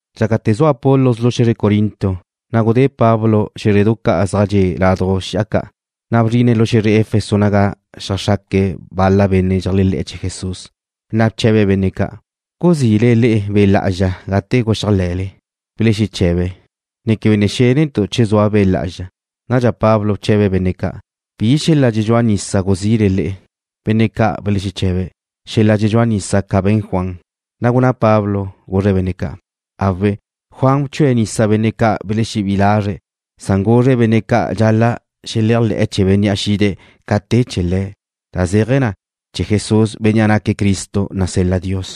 Dxácate̱ zua Apolos lu xe̱zre Corinto, na' gudé Pablo xé̱zredu ca' zaj dxe' laduj xi'a ca', na' bzrine̱' lu xe̱zre Efeso naga xeajxraque̱' bal-la benne' dxeléajle̱'e̱ chee̱ Jesús. Na' bche̱be̱' benne' ca': ―¿Guzi'le le'e Be' Lá'azxa gate guxéajle̱le? Belexeche̱be̱': ―Ne quebe xénentu' che zua Be' Lá'azxa. Nadxa Pablo bche̱be̱' benne' ca': ―¿Bi xel-la' dxedxúa nisa guzi'le le'e? Benne' ca' belexeche̱be̱': ―Xela dxuchúa nisa ca be̱n Juan. Na' gunná Pablo, guzre̱' benne' ca': ―Awe', Juan bchue̱' nisa benne' ca' belexebí'i lazre̱', san guzre̱' benne' ca' dxal-la' xeléajle̱'e̱ chee̱ Bénnea' xide̱' ca te chee̱ le̱', da zéaje̱ na, chee̱ Jesús, Bénnea' naque̱' Cristo, nasel-la Dios.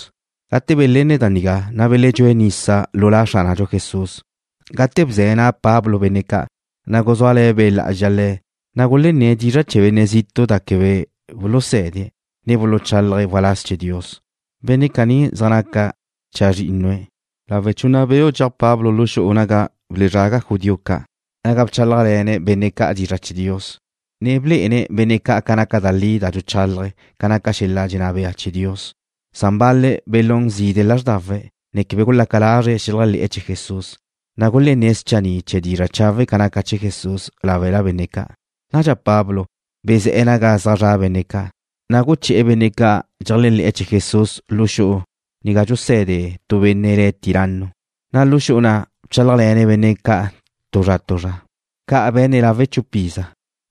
Gate belenne̱' da nigá, na' beledxúe̱' nisa lu La Xránadxu Jesús. Gate bze̱ na' Pablo benne' ca', na' guzúale̱ Be' Lá'azxa le̱', na' gulenné̱' dizra' chee̱ benne' zitu' da quebe buluse̱de̱', ne buluchálaje̱' waláz chee̱ Dios. Benne' caní zaj naca chazrínnue̱'. Lawe' chunna beu' dxeaj Pablo lu xu'u ca' naga buluzraga judío ca' naga bchálajle̱ne̱' benne' ca' dizra' chee̱ Dios, ne blé'ene̱' benne' ca' naca da li da dxuchálaje̱' ca naca xel-la' dxenná bea chee̱ Dios. Bal-le̱' belún zide' lázrdawe̱', ne quebe gulaca lazre̱' xeléajle̱'e̱ chee̱ Jesús, na' gulenné̱' schanni' chee̱ dizra' chawe' ca naca chee̱ Jesús láwela benne' ca'. Nadxa Pablo bezé̱'e̱ naga zaj zra' benne' ca', ne guché̱'e̱ benne' ca' dxeléajle̱'e̱ chee̱ Jesús lu xu'u ga dxuse̱de tu benne' le̱' Tiranno, na' lu xu'u na' bchálajle̱ne̱' benne' ca' tu zra tu zra. Ca' be̱ne̱' lawe' chupa iza,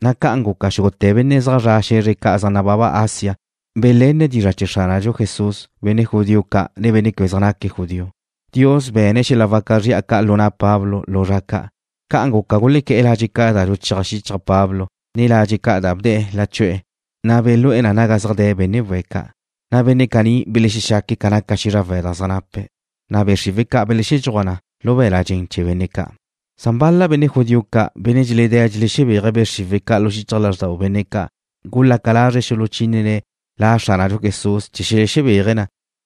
na' ca'an guca xúgute̱ benne' zaj zre̱'e̱ xe̱zre ca' zaj nababa Asia belenne̱' dizra' chee̱ Xránadxu Jesús, benne' judío ca', ne benne' quebe zaj naque̱' judío. Dios be̱ne̱' xel-la' waca zri'a ca' lu na' Pablo lu zra ca'. Ca'an guca, gulequé̱'e̱ ladxe' ca' da dxuchéaj xichaj Pablo, ne ladxe' ca' da bde̱'e̱ lachu'e̱, na' belú'e̱ na naga zaj de̱ benne' we̱' ca', na' benne' caní belexexaque̱' ca naca xízrawe̱' da zaj nape̱', na' be' xriwe̱' ca' belexedxúaj na lu be̱l-la' dxen chee̱ benne' ca'. Bal-la benne' judío ca', benne' dxeledé̱' dxelexebéaje̱' be' xriwe̱' ca' lu xichaj lázxdau benne' ca', gulaca lazre̱' xuluchínene̱' La Xránadxu Jesús chee̱ xelexebéaje̱' na,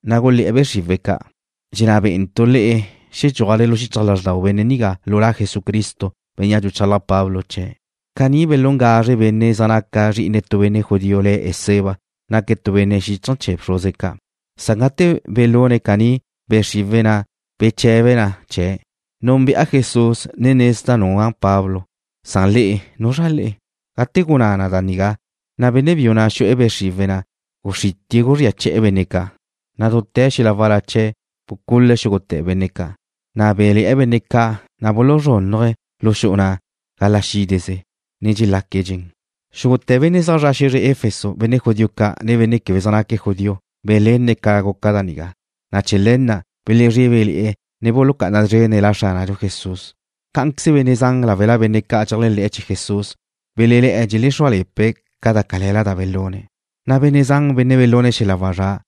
na' gulé̱'e̱ be' xriwe̱' ca': ―Dxenná bé'entu' le'e xedxúajle lu xichaj lázxdau benne' nigá lu La Jesucristo, Bénnea' dxuchalaj Pablo chee̱'. Caní belún gazre benne' zaj naque̱' zri'ine tu benne' judío le̱' Esceva, naque̱' tu benne' xíchaje̱ chee̱ bxruze ca'. Gate belune̱' caní, be' xriwe̱' na' beche̱be na chee̱': ―Núnbe'a Jesús, ne nezda' nua' Pablo, san le'e, ¿nuzra le'e? Gate gunná na da nigá, na' benne' biu na' xu'e̱ be' xriwe̱' na', guxritie̱' guzría che̱'e̱ benne' ca', na' dute̱ xel-la' wal-la chee̱' bucule̱' xúgute̱ benne' ca', na' bé̱'le̱'e̱ benne' ca' cadxa buluzrúnnuje̱' lu xu'u na' gala' xídeze, ne dxelaque̱' dxen. Xúgute̱ benne' zaj zre̱'e̱ xe̱zre Efeso, benne' judío ca', ne benne' quebe zaj naque̱' judío, belenne̱' ca guca da nigá, na' chee̱ le̱ na' belezrébele̱'e̱, ne bulucá'ana szrene̱' La Xránadxu Jesús. Cá'anqueze benne' zan láwela benne' ca' dxeléajle̱'e̱ chee̱ Jesús belelé̱'e̱ dxelexrúale̱pe̱' da cale̱la da belune̱', na' benne' zan, benne' belúne̱' xel-la' wazrá',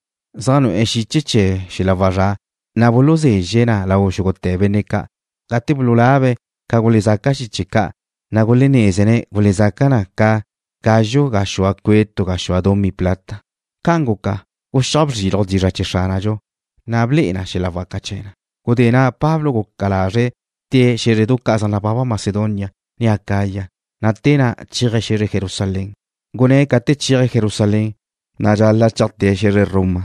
zaj nu'e̱ xiche chee̱ wazrá', na' buluzezxe̱' na lau xúgute̱ benne' ca'. Gate bululabe̱' ca gulezaca xiche ca', na' gulenézene̱' gulezaca na ca gazxu gaxúa cue' tu gaxúa dumí plata. Ca'an guca, guxíaj bzriluj dizra' chee̱ Xránadxu, ne ble'e na xel-la' waca chee̱ na. Gudé na' Pablo guca lazre̱' tée̱' xé̱zredu ca' zaj nababa Macedonia, ne Acaya, na' te na' chéaje̱' xe̱zre Jerusalén. Gunné̱' ca te chéaje̱' Jerusalén, na' dxal-la' cheajte̱' xe̱zre Roma.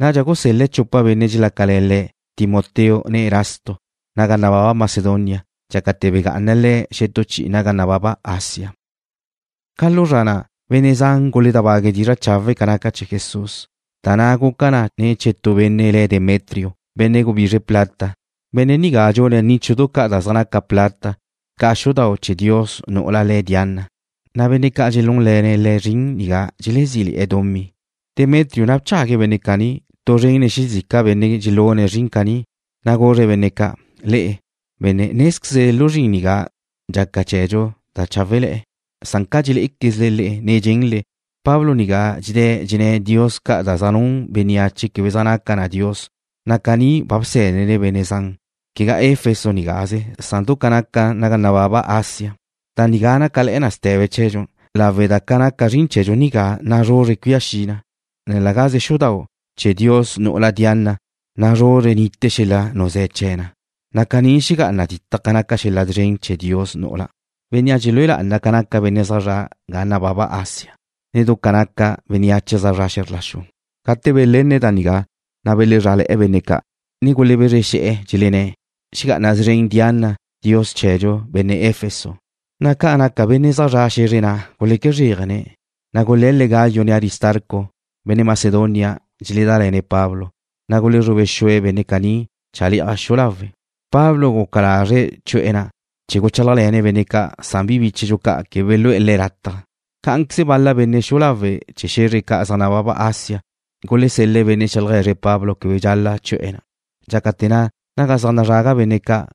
Nadxa gusel-le̱' chupa benne' dxelácale̱ le̱', Timoteo ne Erasto, naga nababa Macedonia, dxácate̱ begá'ana le̱' xetú chi'i naga nababa Asia. Ca lu zra na' benne' zan guledábague̱' dizra' chawe' ca naca chee̱ Jesús, da na' guca na ne̱ chee̱ tu benne' le̱' Demetrio, benne' gubizre plata. Benne' nigá dxune̱' níchudu ca' da zaj naca plata ca xudau' chee̱ dios nu'ula le̱' Diana, na' benne' ca' dxelúnle̱ne̱' le̱' zrin nigá dxelezí'le̱'e̱ dumí. Demetrio na' bchague̱' benne' caní tu zren nen xezica benne' dxelune̱' zrin caní, na' guzre̱' benne' ca': ―Le'e, benne', nézquezle lu zrin nigá dxaca chee̱dxu da cháwele̱'e̱, na' ca dxelé'equezle le'e ne dxenle, Pablo nigá dxedé̱' dxenné̱' dios ca' da zaj nun bénneache quebe zaj naca na dios, na' caní ba bsé̱dene̱' benne' zan, quegá Efeso nigáze, san du ca nababa Asia. Da nigá nácale̱'e̱ na ste̱be chee̱dxu, lawe' da ca naca zrin chee̱dxu nigá nazruzre cuía xi na, ne la gaze xudau' chee̱ dios nu'ula Diana nazruzre nite xel-la' nuzé̱ chee̱ na, na' caní xegá'ana ditaj ca naca xel-la' szren chee̱ dios nu'ula, bénnea' dxelúe lá'ana ca naca benne' zaj zre̱'e̱ ga nababa Asia, ne du ca naca bénneache zaj zre̱'e̱ xe̱zr la xu. Gate belenne̱' da nigá, na' belezrá'ale̱'e̱ benne' ca', ne gulebezre xe̱'e̱, dxelenné̱': ―¡Ga'ana szren Diana, dios chee̱dxu, benne' Efeso! Na' ca naca benne' zaj zre̱'e̱ xe̱zre na' guleque zréajene̱'. Gule̱le̱' Gayo, ne Aristarco, benne' Macedonia dxeledále̱ne̱' Pablo, na' gulezrube xue̱' benne' caní chale'aj xu'u lawe'. Pablo guca lazre̱' chu'e̱ na' chee̱ guchálajle̱ne̱' benne' ca', san bi bíchedxu ca' quebe gulegú'e̱ le̱' lataj. Cá'anqueze bal-la benne' xu'u lawe' chee̱ xe̱zre ca' zaj nababa Asia gulesel-le̱' benne' xeaje̱zre̱' Pablo quebe dxal-la' chu'e̱ na'. Dxácate̱ na', naga zaj nazraga benne' ca',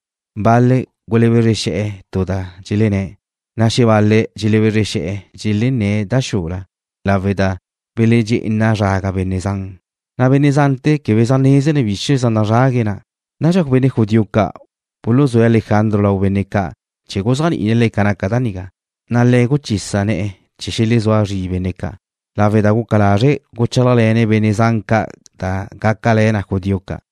bal-le̱' gulebezre xe̱'e̱, tu da dxelenné̱', na' xebal-le̱' dxelebezre xe̱'e̱, dxelenné̱' da xula, lawe' da beledxé'ena zraga benne' zan, na' benne' zante̱ quebe zaj nézene̱' bizr chee̱ na' zaj nazrague̱' na'. Nadxa benne' judío ca' buluzúe̱' Alejandro lau benne' ca' chee̱ guzéajni'ine̱' le̱' ca naca da nigá, na' le̱' guchisa ne̱'e̱ chee̱ xelezúa zri benne' ca' lawe' da guca lazre̱' guchálajle̱ne̱' benne' zan ca' da gácale̱ na judío ca'.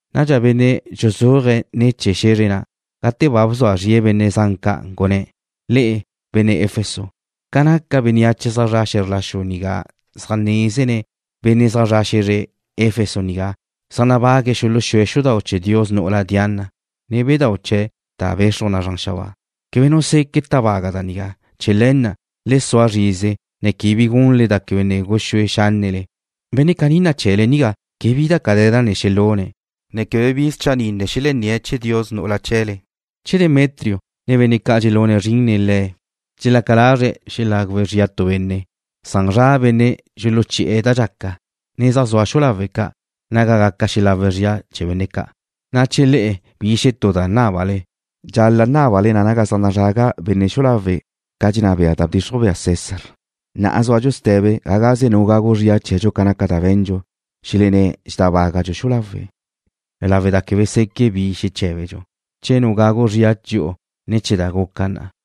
Nadxa benne' dxuzúaje̱' ne̱ chee̱ xe̱zre na', gate ba bzua zrie̱' benne' zan ca', gunné̱': ―Le'e, benne' Efeso. Ca naca bénneache zaj zra' xe̱zr la xu nigá zaj nézene̱' benne' zaj zre̱'e̱ xe̱zre Efeso nigá zaj nabague̱' xuluxúe̱' xudau' chee̱ dios nu'ula Diana, ne bedáu' chee̱' da bexruj na zran xabáa. Quebe nu seque' tábaga' da nigá. Chee̱ le̱ na' le sua zrize, ne quebe bi gunle da quebe ne guxúe xánnele. Benne' caní nache̱'le nigá quebe bi da cale̱la ne xelune̱', ne quebe bi schanni' ne xelenné̱' chee̱ dios nu'ula chee̱le. Che Demetrio, ne benne' ca' dxelune̱' zrin nen le̱' dxelaca lazre̱' xelagu zria chee̱ tu benne', zaj zra' benne' dxuluchi'e̱ da dxaca, ne zaj zua xu'u lawe' ca' naga gaca xelawe̱' zría chee̱ benne' ca'. Na' che le'e bi xetú da nábale, dxal-la' nábale na naga zaj nazraga benne' xu'u lawe' ca dxenná bea da bdxixruj bea César. Na'a zúadxu ste̱be ga gaze nu gagu zria chee̱dxu ca naca da be̱ndxu, xelenné̱' dxedábagadxu xu'u lawe' lawe' da quebe seque' bi xeché̱bedxu che nu gagu zria dxi'u ne̱ chee̱ da guca na'a.